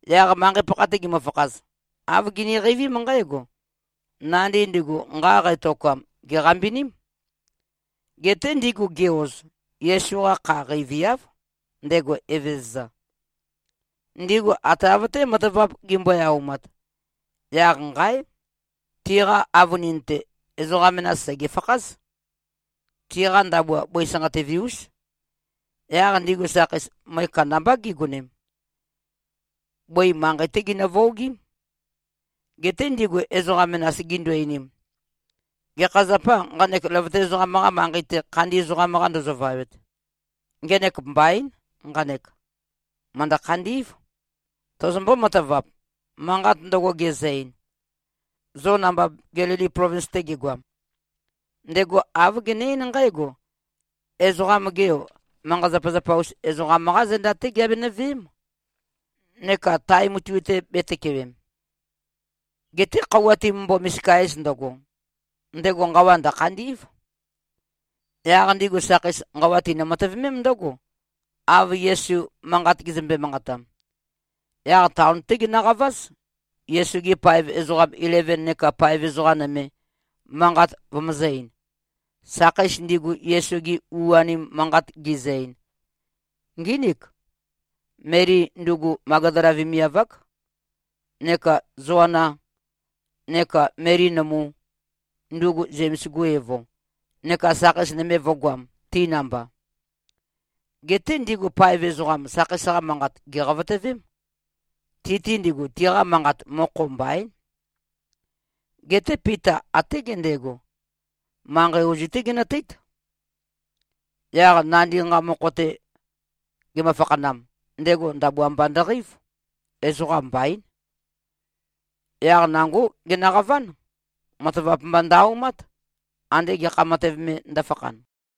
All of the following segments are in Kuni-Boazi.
Yaq manqei-pakha-te gimøfakhaz, āv giniqeivím nqǽgo: Nandi ndigu nqa qætokam, gèqambiním. Geté ndigu gi-oz, Yesu-qa kha qeiviáv, ndego Evezøza. Ndigu ate av-té matavap gimbøe-aumat, yaq nqáe! Tiqa avønin-te, ezoqa menas sègefakház. Tiqa ndabua bøi sanqatøve-ús. Yaq ndigu sakheis, møe kandambá gigonem. Bøi manqei-té ginøvøogím. Geté ndigu ezoqa menas gindu-einim, “Gekha zapâ, nqanek løvøte ezoqam-qa manqei-te, khandi ezoqam-qa ndozovawet? Ngenek mbaín, nqanek. Mø̀ndø-khandí꞉v. Tozombó-matavap, manqat ndøgo gezø-ein, zo namba Gelili plovins-te gegoam? Ndego āv gene-eín nqǽgo, ‘Ezoqam-ge Yo, manqa-zapazapa-us ezoqam-qá zenda-té giabenø-veém, neka tae mutui-te bētøkewem. Geté khøuwa timømbo-misika-ez ndøgo, ndego nqawa ndø̀khandí꞉v.’” Yaq ndigu sakheis, nqawa tinø-matøvemém ndǿgo, av Yesu manqat gezømbe-manqatam. Yaq taon-té ginøqaváz, Yesu-gi paev ezoqa ileven neka paev ezoqa nøme, manqat vømøzø̄-ein. Sakheis ndigu, Yesu-gi u-anim manqat gizø-ein, ngínik: Meli, ndugu Magdala vemiav-ák, neka Zoanā, neka Meli nømu, ndugu Zems-gu evo, neka sakheis nøme vø̄goam, ti namba. Geté ndigu paev ezoqam, sakheis-qa manqat gèqavotøvém. Ti-te ndigu, tiqa manqat, mokho mbaín. Geté Pita até gendego, manqei ozu-té genøteít. Yaq nandi nqa mokho-te gemø-fakhanam, ndego ndabua mba ndøqeív. Ezoqam mbaín. Yaq nangó genøqaván. Matavap mba ndø-aumát, ande gekha matev me ndø̄fakhan.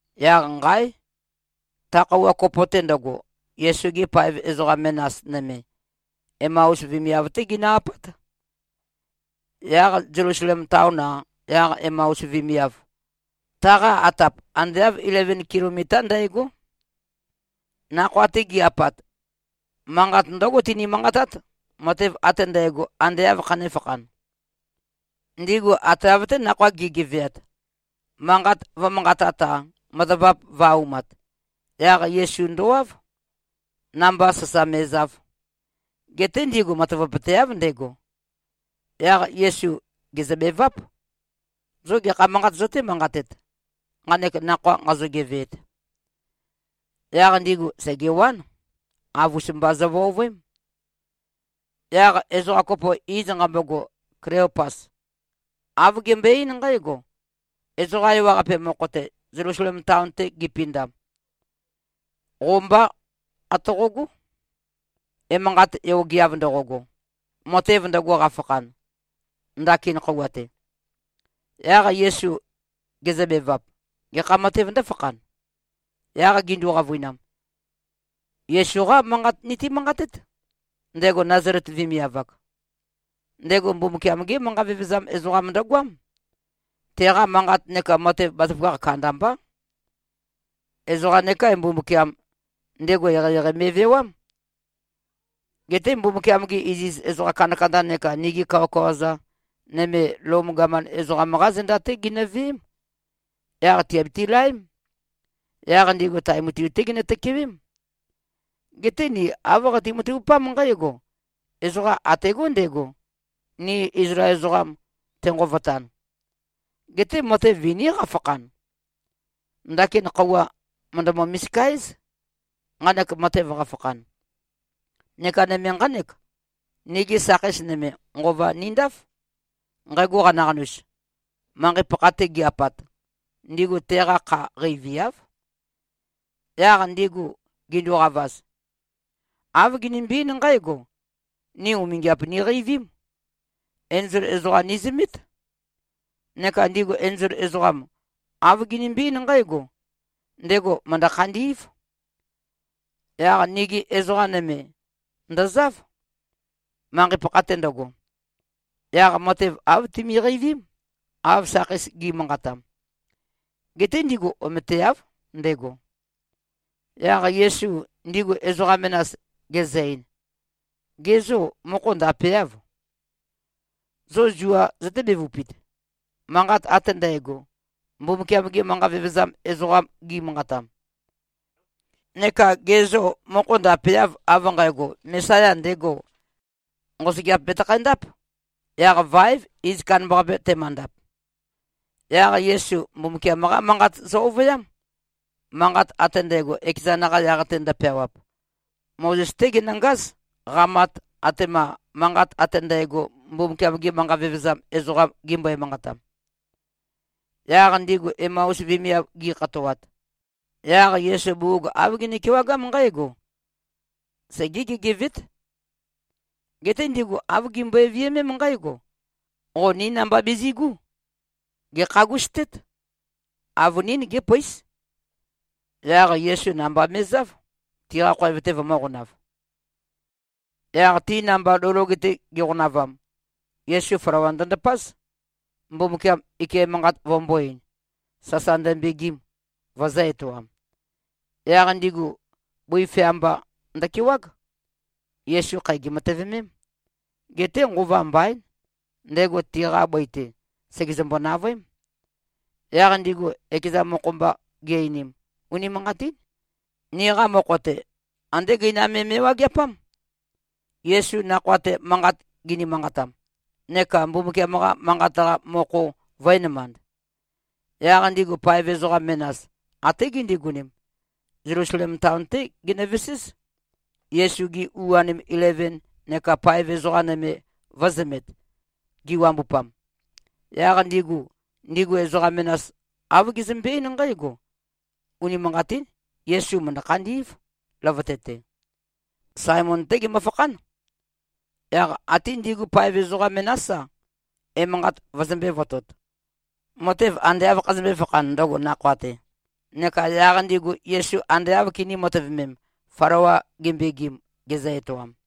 Yaq nqáe! Ta khøuwa kopo-te ndøgo, Yesu-gi paev ezoqa menas nøme, Emaus vemiav-té ginø-apát. Yaq Zelusalem taon-a, yaq Emaus vemiav, taqa atap ande āv ileven kilomitá ndægó. Nakhoa-te gi꞉-apat, manqat ndǿgo tini-manqatát, matev ate ndægo, ande āv khanēfakhan. Ndigu ate av-té, nakhoa gi꞉geveat, manqat vø̄manqatat-a, matavap vø̄-aumat, yaq Yesu ndowáv, namba sasa me꞉zav. Geté ndigu matavapøteáv, ndego. Yaq Yesu gèzøbeváp, “Zo gekha manqat zøté-manqatet, nqanek nakhoa nqazo-geveet?” Yaq ndigu sègewán. Avus-mba zøvøovøém. Yaq ezoqa kopo, iz nqambogo Kleopas, āv gembøe-eín nqǽgo, “Ezoqa ewaqape mokho-te, Zelusalem taon-te gipindam, qo mbá atoqogó, emanqat yogeav ndoqogo, matev ndøgo qafakhan, ndakin khøuwa-te.” Yaq Yesu gezøbevap, “Gekha matēv ndǿfakhan?” Yaq gindu-qavøinam, “Yesu-qá manqat niti-manqatét, ndego Nazalet vemiav-ak. Ndego Mbumbukiam-gé manqa vevezam ezoqam ndøgoám. Teqa manqat neka matev bazaføgakh kandambá. Ezoqam nekā-e, Mbumbukiam, ndego eqeieqei me꞉vewám. Geté Mbumbukiam-gi iziz ezoqa kandakanda neka nigi kawakawa-za nøme, Lom gaman ezoqam-qá zenda-té ginøveém. Yaq tìabiti-laém. Yaq ndigu tae mutui-té ginø-tøkewém. Geté ni āv qati-matavupám nqǽgo: Ezoqam ategó ndego, ni Izlael ezoqam tenqovotan. Geté matev viní qafakhan. Ndakin khøuwa mø̀ndømø-misika-éz, nqanek matev qafakhan. Neka nøme nqánek: Nigi sakheis nøme, nqova nindáf. Nqægo qanaqanus, manqei-pakha-te gi-apat, ndigu teqa kha qeiviáv. Yaq ndigu ginduqavaz, āv ginimbi-eín nqǽgo, ‘Ni umingiap niqeivím. Enzol ezoqam nizømét. Neka ndigu enzol ezoqam, āv ginimbi-eín nqǽgo, ndego mø̀ndø-khandí꞉v.’ Yaq nigi ezoqa nøme ndøzáv, manqei-pakha-te ndøgo. Yaq matev āv timiqeivím, av sakheis gi꞉manqatam. Geté ndigu ometeáv, ndego.” Yaq Yesu ndigu ezoqa menas gezø-ein, “Ge zô, mokho ndapeâv? Zo zuā zøté-bevupit, manqat ate ndægo, Mbumbukiam-gi manqa vevezam ezoqam gi꞉manqatam? Neka gê, zo mokho ndapeâv, av nqægo, Mesaya ndego, nqosøgeap betøkhæ-ndáp, yaq váev iz kandambaqape temøndap.” Yaq Yesu Mbumbukiam-qá Manqat zø-ovøyám, manqat ate ndægo, ekezan-qa yaq-te ndøpeawap. Mozes-té genøngáz, qamat, atema manqat ate ndægo, Mbumbukiam-gi manqa vevezam ezoqam gimbøe-manqatam. Yaq ndigu Emaus vemiav gi꞉khatoat, yaq Yesu bugug āv gene-kewagám nqǽgo: Segē-gegevēt. Geté ndigu āv gimbøe-viømém nqǽgo, “Qo ní namba bizi꞉gú. Gèkhagustét. Avønín gépøís.” Yaq Yesu namba me꞉záv, tiqa khoev-te vømø̄qonav. Yaq ti namba lou loge-te giqonavam, Yesu flawa ndøndapáz, Mbumbukiam ike manqat vømbō-ein, sasa ndømbegim, vø̄zø-etoam. Yaq ndigu bøi fea mba ndøkewág. Yesu khæ gèmatøvemém. Geté nqova mbaín, ndego tiqa bøi-te, sègezømbo-navøém. Yaq ndigu ekeza mokho-mba gi-einim, “Unimanqatín. Niqa mokho-te, andé gøinam me me꞉wageapám, Yesu nakhoa-te manqat gini-manqatam, neka Mbumbukiam-qa Manqat-qa mokho vø̄enømand.” Yaq ndigu paev ezoqa menas, até gindigonem, Zelusalem taon-té ginøveséz, Yesu-gi u-anim ileven neka paev ezoqa nøme vø̄zømet, giwambupam. Yaq ndigu, ndigu ezoqa menas āv gizømbe-eín nqǽgo, “Unimanqatín. Yesu mø̀ndø-khandí꞉v, løvøte-te. Saemon-té gemøfakhán.” Yaq ate ndigu paev ezoqa menás-a, emanqat vøzømbē-votot, matev ande āv khazømbē-fakhan, ndøgo nakhoa-te, neka yaq ndigu Yesu ande āv kinī-matøvemem, flawa gembegim, gezø-etoam.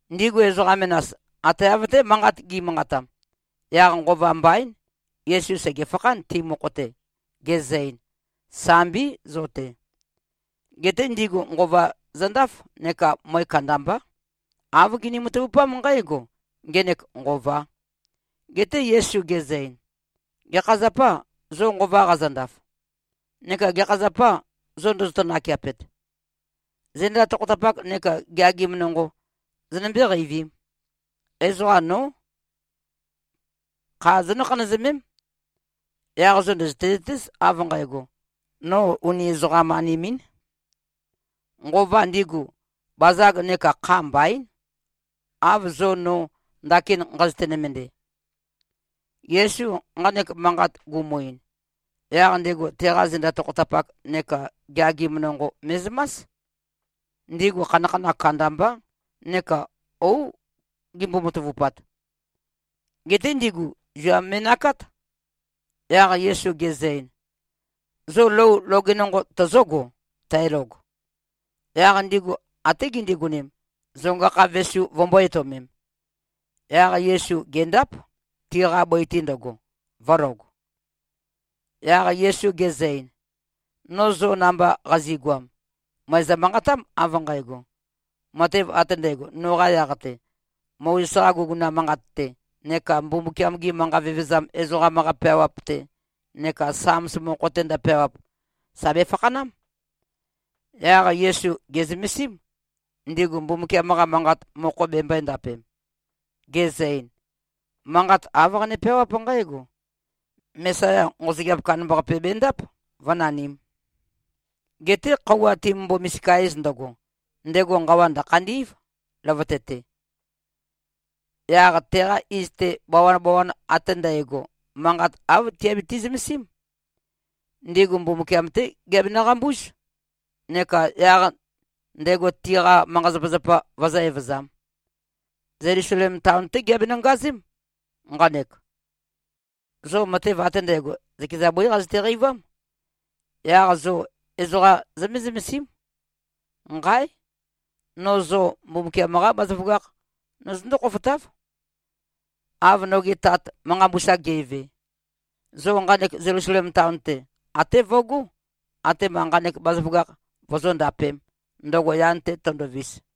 Ndigu ezoqa menas, ate av-té manqat gi꞉manqatam, yaq nqova mbaín, Yesu sègefakhán, ti mokho-te, gezø-ein, “Sambí, zo-te.” Geté ndigu nqova zøndáf neka møe kandambá. Āv gini-matavupám nqǽgo: Ngenek nqovā. Geté Yesu gezø-ein, “Gekha zapâ, zo nqova qazøndaf? Neka gekha zapâ, zo ndozoto-nakeapet? Zenda tokhotapak neka geagim nonqo zonømbé-qeivīm. Ezoqa nó. Kha zonǿ-khanøzømém. Yaq zo ndø̀zøte-zøtéz, av nqægo, no uni ezoqam-anim-ín. Nqova ndigu, bazag neka kha mbaín, av zo no ndakin nqazøte-nømende.” Yesu nqanek manqat gumu-ein, yaq ndego teqa zenda tokhotapak neka geagim nonqo me꞉zømás. Ndigu khanakhanakh kandambá neka óu gimbo-matavupat. Geté ndigu zua me꞉nakát. Yaq Yesu gezø-ein, “Zo lou loge nonqo tøzǿgo, tælog?” Yaq ndigu até gindigonem, zonga-kha vesu vømbó-etøomem. Yaq Yesu gèndáp, tiqa bøi-te ndøgo, vø̄log. Yaq Yesu gezø-ein, “No zo namba qazi꞉goam, mø̀ezø-manqatám, av nqægo: Matev ate ndægo, noqa yaq-te, Mozes-qa guguna manqat-te neka Mbumbukiam-gi manqa vevezam ezoqam-qa peawap-te neka Sams mokho-te ndøpeawap, sà befakhanám.” Yaq Yesu gè꞉zømesím, ndigu Mbumbukiam-qa Manqat mokho bembøē-ndapem, gezø-ein, “Manqat āv qane-peawáp nqǽgo: Mesaya nqosøgeap kandambaqape bendáp, vǿnanīm. Geté khøuwa timømbo-misika-ez ndøgo, ndego nqawa ndø̀khandí꞉v, løvøte-te. Yaq teqa iz-te, bawabawan ate ndægo, manqat āv tiabiti-zømesím. Ndigu Mbumbukiam-té giabenø-qambúz neka yaq ndego tiqa manqa-zapazapa vøzǿ-evøzām. Zelusalem taon-té giabenø-ngazém, nqanek. Zo matev ate ndægo, zøkeza bøí qazøte-qeivám. Yaq zo ezoqa zømé-zømesím. Nqáe! No zo Mbumbukiam-qá bazaføgakh nozøndó-khofotáv, av noge Tat, manqa mbusa ge꞉ve. Zo nqanek Zelusalem taon-te, até vøgó, atema nqanek bazaføgakh vozóndapēm, ndøgo yan-te tøndovis.”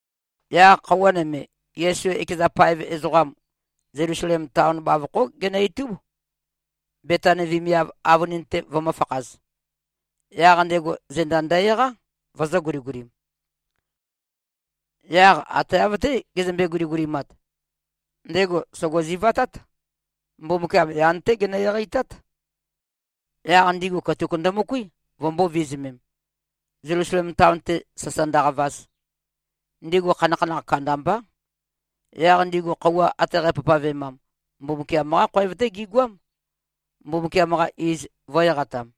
Yaq khøuwa nøme, Yesu ekeza paev ezoqam, Zelusalem taon bavokhó genø-itúb, Betani vemiav avønin-te vømø̄fakhaz. Yaq ndego zenda ndø-eqá, vøzø̄-guligulim. Yaq ate av-té gezømbe-guligulimat, ndego sògo-zivatát. Mbumbukiam yan-té genø-eqeitát. Yaq ndigu katuk ndømøkuí, vømbō-vizumem, Zelusalem taon-te sasa ndøqavaz. Ndigu khanakhanakh kandambá. Yaq ndigu khøuwa ate qæpavpavemam, Mbumbukiam-qá khoev-té gigoám, Mbumbukiam-qa iz vø̄-eqatam.